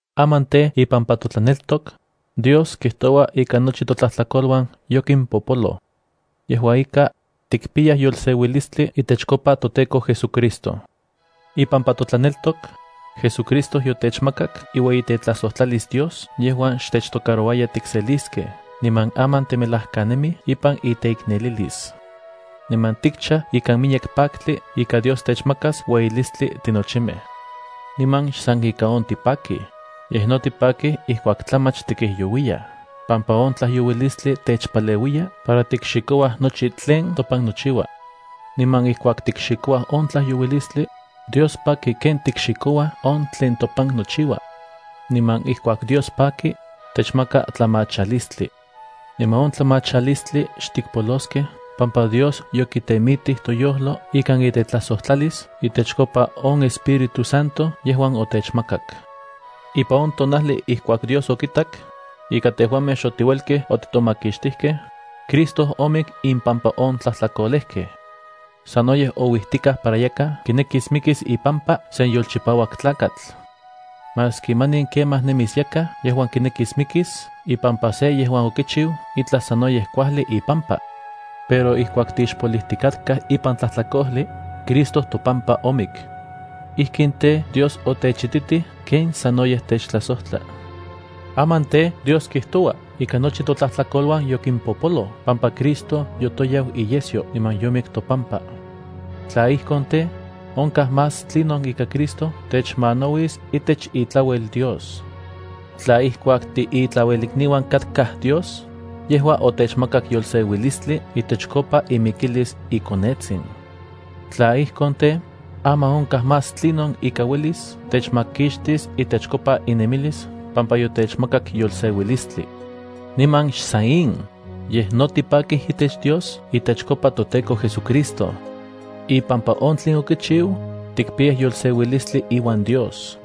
Aman tej, ipampa totlaneltok, Dios kijtoua ika nochi totlajtlakoluan yokimpopoluij. Yejua ika, tikpiyaj yolseuilistli itechkopa toTEKO JesuCristo. Ipampa totlaneltok, JesuCristo yotechmakak iueyitetlajsojtlalis Dios yejuan xtechtocarouaya tikseliskej niman aman timelajkanemij ipan iteiknelilis. Niman tikchaj ikan miyek paktli ika Dios techmakas ueyilistli tinochimej. Niman xsan ika on tipakij, yej no tipakij ijkuak tlamach tikijyouiyaj pampa on tlajyouilistli techpaleuiyaj para tikxikouaj nochi tlen topan nochiua. Niman ijkuak tikxikouaj on tlajyouilistli, Dios paki ken tikxikouaj on tlen topan nochiua. Niman ijkuak Dios paki, techmaka tlamachalistli. Niman on tlamachalistli xtikpoloskej pampa Dios yokitemitij toyojlo ikan itetlajsojtlalis itechkopa on Espíritu Santo yejuan otechmakak. Ipan on tonajli ijkuak Dios okitak ika tejuamej xotiuelkej otitomakixtijkej, Cristo omik impampa on tlatlajkolejkej. Sanoyej ouijtikaj para yakaj mikis ipampa sen yolchipauak tlakatl. Maski manin kemaj nemis yakaj yejuan mikis ipampa se yejuan sanoyej kuajli tlakatl. Pero ijkuak tixpolijtikatkaj ipan tlajtlakojli, Cristo topampa omik. Ijkin tej, Dios otechititij ken sanoyej techtlajsojtla. Aman tej, Dios kijtoua ika nochi totlajtlakoluan yokimpopoloj pampa Cristo yotoyau iyesyo niman yomik topampa. Tla ijkon tej, onkaj más tlinon ika Cristo techmanauis itech itlauel Dios. Tla ijkuak tiitlauelikniuan katkaj Dios, yejua otechmakak yolseuilistli itechkopa imikilis iKonetsin. Tla ijkon tej, aman onkaj más tlinon ika uelis techmakixtis itechkopa inemilis pampa yotechmakak yolseuilistli. Niman xsan in, yej no tipakij itech Dios itechkopa toTEKO JesuCristo. Ipampa on tlen okichiu, tikpiyaj yolseuilistli iuan Dios.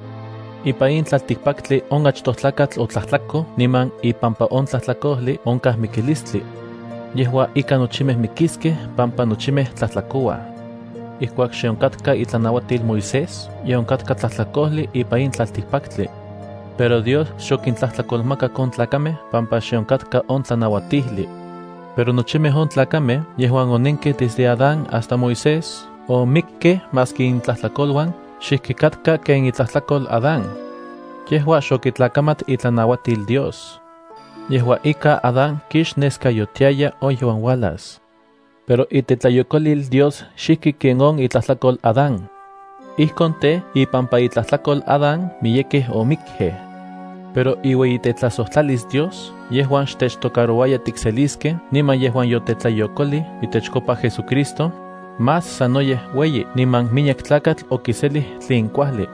Ipan in tlaltikpaktli on achtoj tlakatl otlajtlakoj niman ipampa on tlajtlakojli onkaj mikilistli. Yejua ika nochimej mikiskej pampa nochimej tlajtlakouaj. Ijkuak xe onkatka itlanauatil Moisés ye onkatka tlajtlakojli ipan in tlaltikpaktli. Pero Dios xokintlajtlakolmakak on tlakamej pampa xe onkatka on tlanauatijli. Pero nochimej on tlakamej yejuan onenkej desde Adán hasta Moisés omikkej maski intlajtlakoluan xijki katka ken itlajtlakol Adán. Yejua xokitlakamat itlanauatil Dios. Yejua ika Adán kixneskayotiaya on yejuan uajlas. Pero itetlayokolil Dios xijki ken on itlajtlakol Adán. Ijkon tej, ipampa itlajtlakol Adán miyekej omikkej. Pero iueyitetlajsojtlalis Dios yejuan xtechtocarouaya tikseliskej niman yejuan yotetlayokolij itechkopa JesuCristo, más sanoyej ueyi niman miyek tlakatl okiselij tlen kuajli.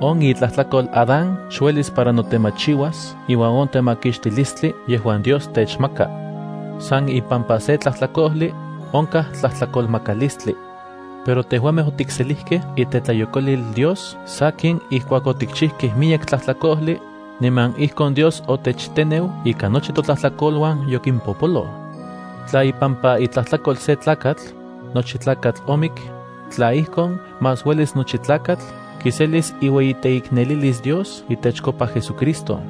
On itlajtlakol Adán xuelis para notemachiuas iuan on temakixtilistli yejuan Dios techmaka. San ipampa se tlajtlakojli, onkaj tlajtlakolmakalistli. Pero tejuamej otikselijkej itetlayokolil Dios sakin ijkuak otikchijkej miyek tlajtlakojli, niman ijkon Dios otechteneu ika nochi totlajtlakoluan yokimpopoloj. Tla ipampa itlajtlakol se tlakatl, nochi tlakatl omik, tla ijkon, más uelis nochi tlakatl kiselis iueyiteiknelilis Dios itechkopa JesusCristo,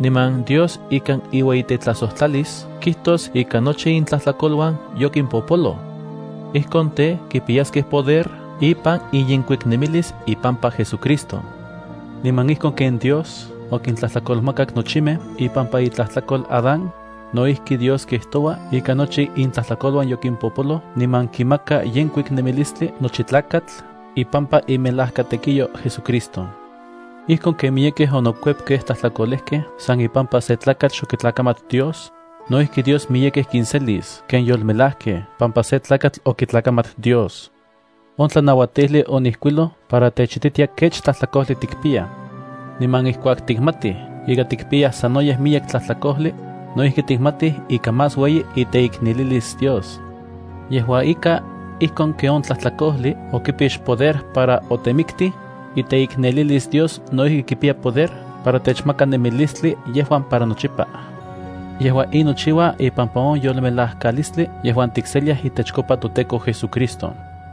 niman Dios ikan iueyitelajsotlalis kijtos ika nochi intlajtlakoluan yokimpopoloj. Ijkon tej, kipiyaskej poder ipan inyenkuiknemilis ipampa JesuCristo. Niman ijkon ken Dios okintlajtlakolmakak nochimej ipampa itlajtlakol Adán, no ijki Dios kijtoua ika nochi intlajtlakoluan yokimpopoloj niman kimaka yenkuik nemilistli nochi tlakatl ipampa imelajkatekiyo JesuCristo. Ijkon ken miyekej onokuepkej tlajtlakolejkej san ipampa se tlakatl xokitlakamat Dios, no ijki Dios miyekej kinselis ken yolmelajkej pampa se tlakatl okitlakamat Dios. On tlanauatijli onijkuiloj para techititia kech tlajtlakojli tikpiyaj. Niman ijkuak tikmatij ika tikpiyaj sanoyej miyek tlajtlakojli, no ijki tikmatij ika más ueyi iteiknelilis Dios. Yejua ika, ijkon ken on tlajtlakojli okipix poder para otemiktij, iteiknelilis Dios no ijki kipiya poder para techmaka nemilistli yejuan para nochipa. Yejua in nochiua ipampa on yolmelajkalistli yejuan tikseliaj itechkopa toTEKO JesuCristo.